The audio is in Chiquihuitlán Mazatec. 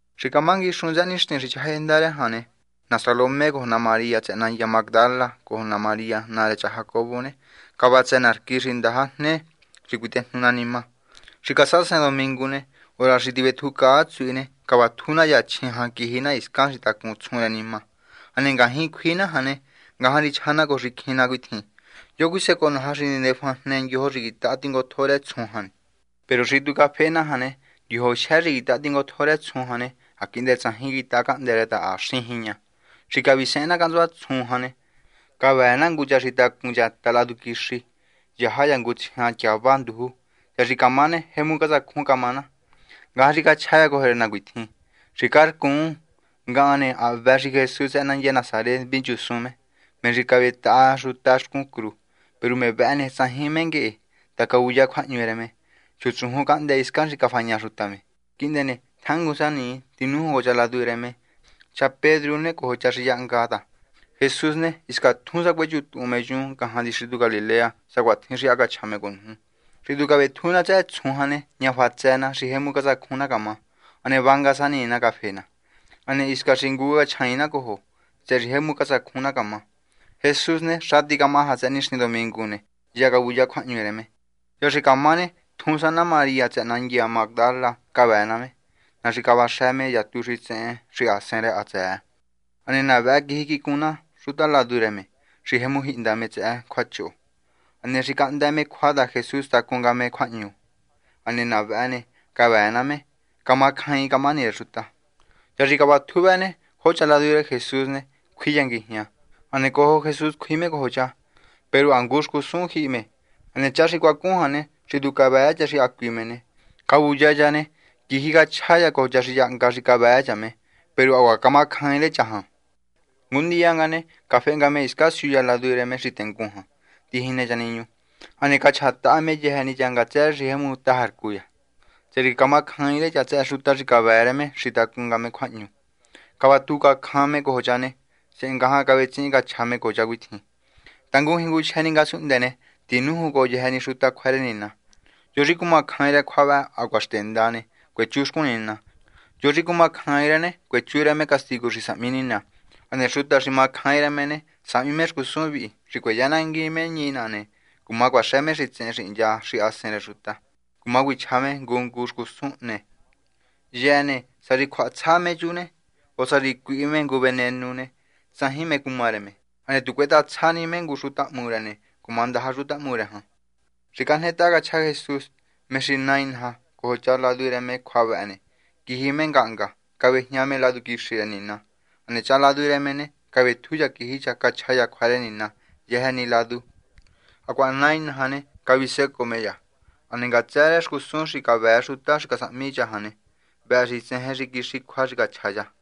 Xi camá nguixun tsëhë nixtin xi chjahájenda rë jan ne, na Salomé cojo na María tsëhë nandya Mágdala cojo na María naa rë cha Jacobo ne, cavatsë na rqui xi ndaja jne xi cuitejnu na nima. Xi casahasen domingu ne, hora xi tivetjucaa tsuhi ne, cavatju na yachjin jan quiji na hiscan tacun tsjun rë nima. Hane ngajñi cjui na jan ne, ngajan xi chja na cojo xicjin na cuitjin: ―¿Yo cuisecoo naja xi nindefajne ndyojo xi quitaha tingotjo rë tsjun jan? Peru xi tu cafehe na jan ne, ndyojo jyë xi quitaha tingotjo rë tsjun jan ne, ha quihndë tsajin quitaha cahndë́ rë ta ha xin jiña. Xi cavisehen na cahntsua tsjun jan ne, cavëë na ngu cha xi tacun cha taha ladu quixi, yaja cha ngu tsjian tyava nduju. Hya xi camá ne, jemu catsacjun camahani na. Ngajan xi cachja cha cojo rë na cuitjin: ―Xicarcuun. Ngahan ne, ha hvë xi Jesús tsëhë nandya Nasaret vinchunsun me, me xi cavetaha xuta xcun cru. Peru me vëhë ne, tsajin me nguehe ta cavuya cjuahñu rë me. Chutsujun cahndë́ hiscan xi cafaña xuta me. Quihndë ne, tjangun sanii ne, tinújun cojo cha ladu rë me, cha Pedru ne cojo cha xi yahnga ta, Jesús ne, hisca tjun cuechutaha me yun ngajan distritu Galilea sacuahatjin xi ha cachja me cojo nuju. Xi tu cavetju na tsëhë tsjun jan ne, ña fatsë na xi jemu catsacjun na camá. Hane vanga sanii na cafe na. Hane hisca xi ngu cachjaain na cojo, tsëhë xi jemu catsacjun na camá. Jesús ne, xati camaha sa tsëhë nixtin domingu ne, hya cavuya cjuahñu rë me. Hya xi camá ne, tjun sa na María tsëhë nandya Mágdala cavëë na me, na xi cavaxë me yatu xitsehen xahasen rë hatsëë. Hane na vëhë quiji quicun na xuta ladu rë me xi jemu jihnda tsëhë cjuachoho. Hane xi cahndë me cjua ta Jesús tacun nga me cjuahñu hane na vëhë ne, cavëë na me, camacjaain rë xuta jan. Hya xi cavatju vëhë ne, jo cha ladu rë Jesús ne cjui cha nguijña. Hane cojo Jesús cjui me cojo cha, peru ha ngu xcusun jyihi me. Hane cha xi cuacun jan ne, xi tu cavëë cha xi hacui me ne, cavuya cha ne, quiji cachja cha cojo cha xi yahnga xi cavëë cha me. Peru hacuaha camacjaain rë cha xi yahnga jan. Ngu ndiya nga ne, cafehe nga me hiscan siu cha ladu rë me xi tengu jan, tijinë cha niñu. Hane cachjataha me yëjë ni cha ngatsë rë xi jemu taja rcu cha, tsëhë xi camacjaain rë cha tsëhë xuta xi cavëë rë me xi tacun nga me cjuahñu. Cavatju cacjan me cojo cha ne, sehe ngajan cavetsihin cachja me cojo cha cuitjin: ―Tangún jingujyë ni ngasunhndë ne, tinújun cojo yëjë ni xuta cjua rë Nina. Yo xi cumacjain rë cjua vëhë hacuaha xtenda ne, cuechu xcun Nina. Yo xi cumacjaain rë ne, cuechu me castigu xi sahmi Nina xi cueyun. Hane xuta xi cumacjain rë me ne, sahmi me xcusun vihi xi cueyanangui me ñihi naha ne: cuma cuaxë me xitsehen xi hincha xahasen rë xuta; cuma cuichja me ngu ngu xcusun hne; yë ne, sá xi cjuahatsja me chu, o sá xi cuihi me ngu venenu ne, tsajin mé cumá rë me; hane tu cuetahatsja ni me xuta hmu rë ne, cumandaja xuta hmu rë jan. Xi cajnetaha cachja Jesús, me xi Nai naja, cojo cha ladu rë me cjua vëhë ne, quiji me ngahnga, cavéjña me ladu quixi tsëhë Nina. Hane cha ladu rë me ne, cavetju cha quiji cha, cachja cha cjua rë Nina yëjë ni ladu. Hacuaha Nai naja ne, cavisecoo me cha. Hane ngatsë rë xcusun xi cavëë xuta xi casahmi cha jan ne, vëhë xi tsejen xi quixi cjua xi cachja cha.